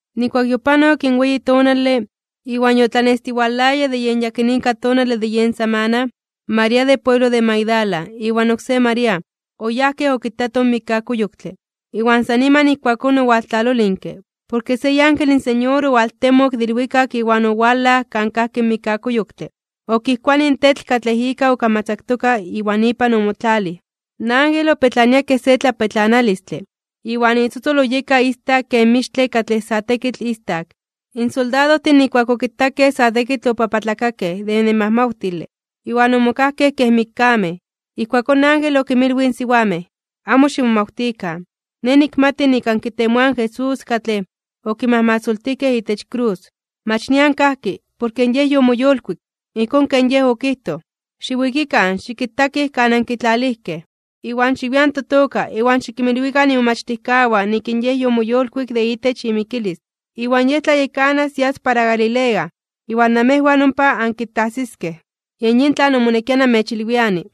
Nijkuak yopanok in weyi tonale, iwan yotlanestiwalaya de yen yakinika tonale de yen samana, María de pueblo de Magdala, iwan oksé María, oyajkej okitatoj in mikkakuyoktle. Iwan san niman ijkuakón owaltlalolinke, porke se iángel in Señor owaltemok de ilwikak iwan owalaj kan kajki in mikkakuyoktle, okijkuanij in tetl katlej ika okamatzaktoka iwan ipan omotlalij. In ángel opetlania kej se tlapetlanalistle, iwan itzotzol oyeka istak kej mixtle katlej sa tekitl istak. In soldadojtin nijkuak okitakej sa tekitl opapatlakakej (obibiokakej) de nemajmawtile, iwan omokajkej kej mikkamej. Ijkuakón in ángel okinmilwij in siwamej: ―Amo ximomawtikan. Nej nikmati nik ankitemoaj in Jesús, katlej okimajmasoltijkej itech krus. Mach nian kajki, porke in Yej yomoyolkuik, ijkón ken Yej okijtoj. Xiwikikan xikitakij kan ankitlalijkej. Iwan xiwian totoka iwan xikinmilwikan imomachtijkawan nik in Yej yomoyolkuik de itech imikilis. Iwan Yej tlayekanas yas para Galilea iwan namejwan ompa ankitajsiskej. Yen yin tlan omonekia namechilwiani.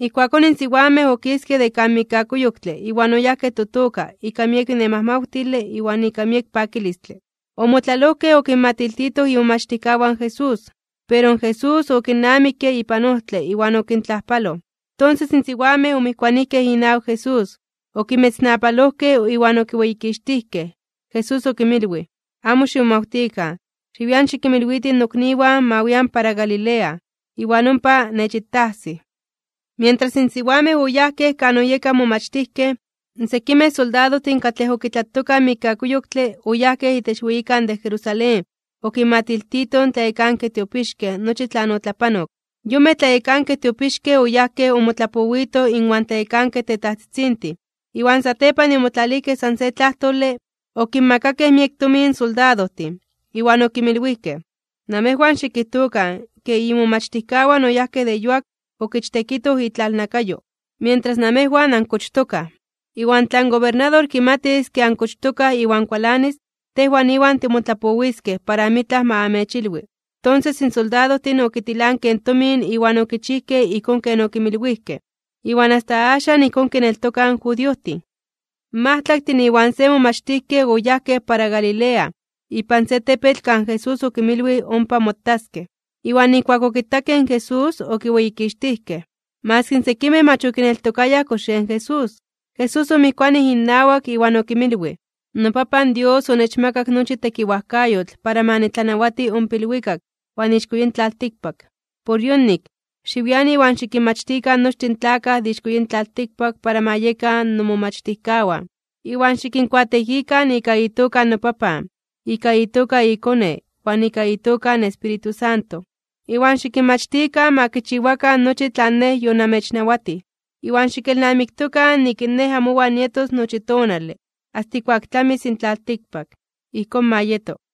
Ijkuakón in siwamej okiskej de kan mikkakuyoktle iwan oyajkej totoka ika miek nemajmawtile iwan ika miek pakilistle. Omotlalojkej okinmatiltitoj imomachtijkawan in Jesús. Pero, Jesús okinnamikke ipan ojtle iwan okintlajpaloj. Tonses in siwamej omijkuanijkej inawak Jesús, okimetznapalojkej iwan okiweyikixtijkej. Jesús okinmilwij: ―Amo ximomawtikan. Xiwian xikinmilwitij nokniwan ma wian para Galilea, iwan ompa nechitajsij. Mientras in siwamej oyajkej kan oyekaj in momachtijkej, sekimej soldadojtin katlej okitlatokaj in mikkakuyoktle oyajkej itech weyikan de Jerusalén okinmatiltitoj in tlayekankej tiopixkej nochi tlan otlapanok. Yonmej tlayekankej tiopixkej oyajkej omotlapowitoj inwan tlayekankej tetajtzitzintin, iwan satepan de omotlalijkej san se tlajtole, okinmakakej miek tomin in soldadojtin, iwan okinmilwijkej: ―Namejwan xikijtokan ke imomachtijkawan oyajkej de yuak okichtekitoj itlalnakayo, mientras namejwan ankochtokaj. Iwan tla in gobernador kimatis ke ankochtokaj iwan kualanis, tejwan iwan timotlapowiskej para amitlaj ma amechilwi. Tonses in soldadojtin okitilankej in tomin iwan okichijkej ijkón ken okinmilwijkej. Iwan asta axan ijkón kineltokaj in judiojtin. In majtlaktin iwan se momachtijkej oyajkej para Galilea, ipan se tepetl kan Jesús okinmilwij ompa motaskej. Iwan nijkuak okitakej in Jesús okiweyikixtijkej. Maski sekimej mach okineltokayaj kox yen Jesús. Jesús omijkuanij innawak iwan okinmilwij: ―NoPapan Dios onechmakak nochi tekiwajkayotl para ma nitlanawati ompa ilwikak iwan ixko yin tlaltikpak. Por yonik, xiwian iwan xikinmachtikan nochtin in tlakaj de ixko yin tlaltikpak para ma yekan nomomachtijkawan. Iwan xikinkuateekikan ika itoka noPapan, ika itoka iKone, iwan ika itoka in Espíritu Santo. Iwan xikinmachtikan ma kichiwakan nochi tlan Nej yonamechnawatij. Iwan xikelnamiktokan nik in Nej amowan nietos nochi tonale, asta ijkuak tlamis in tlaltikpak. Ijkón ma yeto.